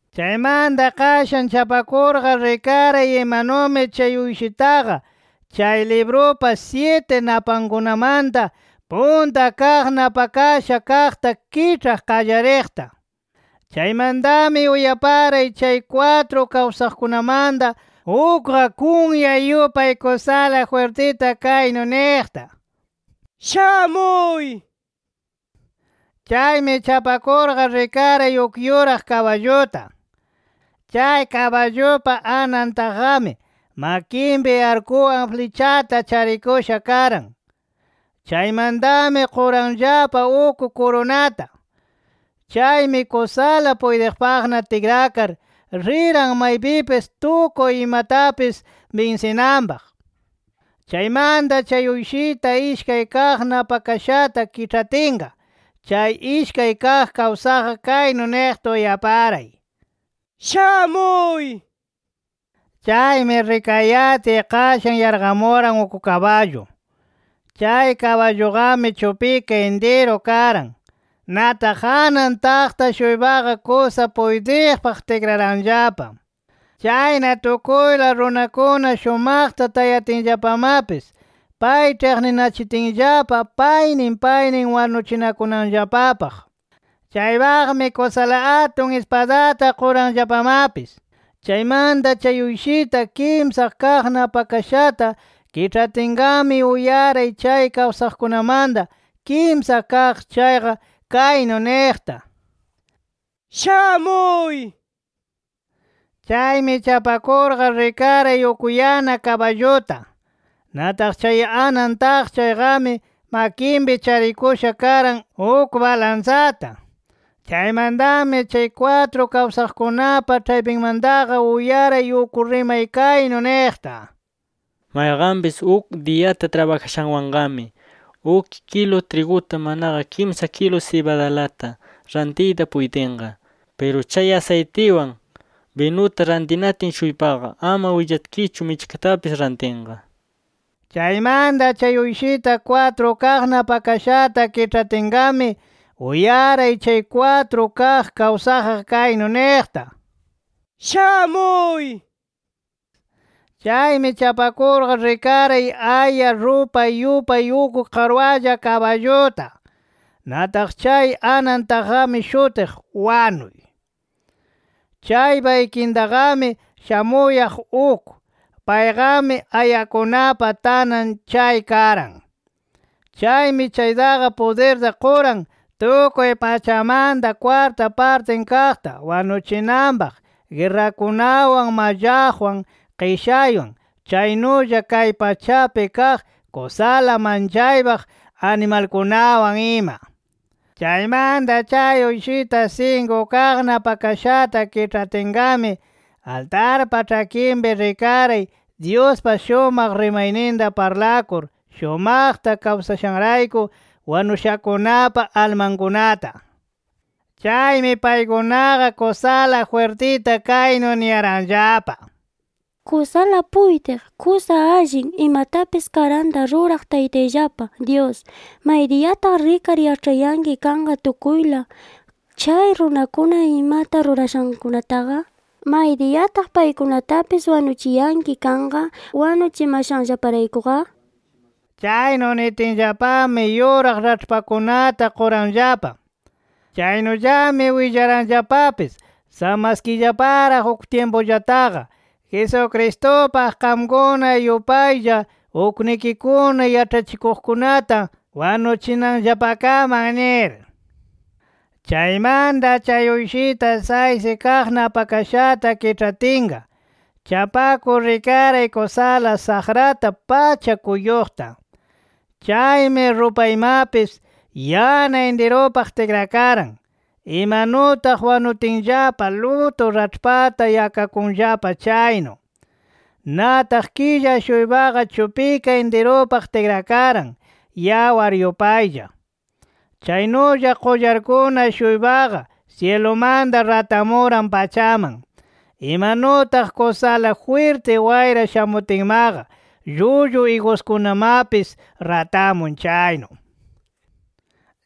Chaymanta qashan chapakurqa rikaray imanumi chay Uyshitaqa chay librupa syiti napankunamanta, punta kaq napakasha kaqta kiĉhaq qallariqta. Chaymantami uyaparay chay kwatru kawsaqkunamanta ukqa, kunya yupay kusala jwirtita kaynu niqta: “¡Shamuy!” nir. Chaymi chapakurqa rikaray uk yuraq kaballuta. Chay kaballupa anan taqqami, makinpi arkuwan flichata charikusha karan. Chaymantami quranllapa uk kurunata. Chaymi kusala puytiqpaqna tikrakar, riran maypipis tukuy imatapis binsinanpaq. Chaymanta chay Uyshita ishkay kaq napakashata kiĉhatinqa, chay ishkay kaq kawsaqqa kaynu niqta uyaparay: “¡Shamuy!” nir. Chaymi rikayatiy qashan yarqamuran uk kaballu. Chay kaballuqami chupika intiru karan. Nataq anan taqta-shuypaqa kusa puytiqpaq tikraranllapa. Chayna tukuyla runakuna shumaqta tayatinllapamapis, pay ĉhiqninachitinllapa paynin paynin wanuchinakunanllapapaq. Chaypaqmi kusala atun ispadata quranllapamapis. Chaymanta chay Uyshita kimsa kaq napakashata kiĉhatinqami, uyaray chay kawsaqkunamanta kimsa kaq chayqa, kaynu niqta: “¡Shamuy!” nir. Chaymi chapakurqa rikaray uk yana kaballuta. Nataq chay anan taq chayqami makinpi charikusha karan uk balansata. Chaymantami chay kwatru kawsaqkunapa ĉhaypinmantaqa uyaray uk rimay kaynu niqta: “Mayqanpis uk diyata trabajashanwanqami uk kilu triguta manaqa kimsa kilu sibadalata rantiyta puytinqa. Piru chay asaytiwan, binuta rantinatin-shuypaqa ama willatkichu michkatapis rantinqa” nir. Chaymanta chay Uyshita kwatru kaq napakashata kiĉhatinqami, uyaray chay kwatru kaq kawsaqqa kaynu niqta: “¡Shamuy!” nir. Chaymi chapakurqa rikaray aya rupay yupay uk qarwalla kaballuta. Nataq chay anan taqqami shutiq, “Wanuy”. Chaypa ikintaqami shamuyaq uk. Payqami ayakunapa tanan chay karan. Chaymi chaytaqa pudirta quran, tukuy pachamanta kwarta partin kaqta wanuchinanpaq guerrakunawan, mallaqwan, qishaywan, chaynulla kay pachapi kaq kusala manchaypaq animalkunawan ima. Chaymanta chay Uyshita sinku kaq napakashata kiĉhatinqami, altarpa ĉhakinpi rikaray Dyuspa shumaq rimayninta parlakur shumaqta kawsashanrayku wanushakunapa almankunata. Chaymi paykunaqa, kusala jwirtita kaynu niyaranllapa: “Kusala puytiq, kusa allin, imatapis karanta ruraq Taytayllapa Dyus, ¿maydiyataq rikar yaĉhayanki kanqa tukuyla chay runakuna imata rurashankunataqa? ¿Maydiyataq paykunatapis wanuchiyanki kanqa wanuchimashanllaparaykuqa?” nir Chaynu nitinllapami yuraq raĉhpakunata quranllapa. Chaynullami willaranllapapis, samaskiyllaparaq uk tyimpullataqa, Jesucristupaq qamkuna yupaylla uknikikuna yaĉhachikuqkunata wanuchinanllapakaman nir. Chaymanta chay Uyshita saysi kaq napakashata kiĉhatinqa, chapakur rikaray kusala saqrata pacha kuyuqta. Chaymi rupaymapis yana intirupaq tikrakaran, imanutaq wanutinllapa lutu raĉhpata yakakunllapa chaynu. Nataq killa-shuypaqa, chupika intirupaq tikrakaran, yawar yupaylla. Chaynulla qullarkuna-shuypaqa syilumanta ratamuran pachaman, imanutaq kusala jwirti wayra shamutinmaqa llullu iguskunamapis ratamun chaynu.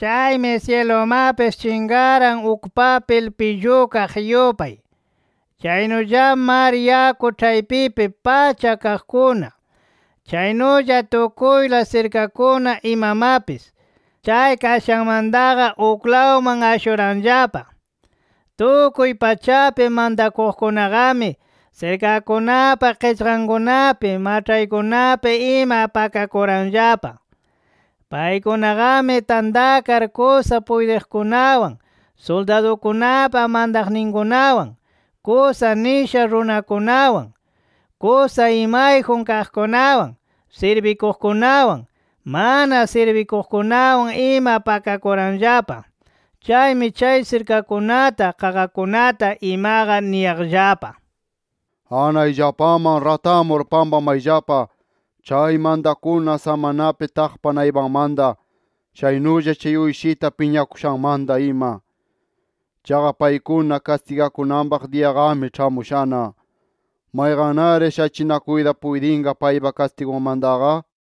Chaymi syilumapis chinqaran uk papil pillukaq yupay. Chaynullami mar yaku ĉhaypipi pacha kaqkuna, chaynulla tukuyla sirkakuna imamapis, chay kashanmantaqa uklawman ashuranllapa. Tukuy pachapi mantakuqkunaqami, sirkakunapa qichqankunapi, maĉhaykunapi ima pakakuranllapa. Paykunaqami tantakar kusa puytiqkunawan, suldadukunapa mantaqninkunawan, kusa nisha runakunawan, kusa imayjun kaqkunawan, sirbikuqkunawan, mana sirbikuqkunawan ima pakakuranllapa. Chaymi chay sirkakunata, qaqakunata imaqa niyaqllapa: “¡Anayllapaman ratamur pakamayllapa chay mantakuna samanapi taqpa naypanmanta, chaynulla chay Uyshita piñakushanmanta ima! Chaqa paykuna kastigakunanpaq diyaqami ĉhamushana. ¿Mayqannari shachinakuyta puytinqa paypa kastigunmantaqa?” nir.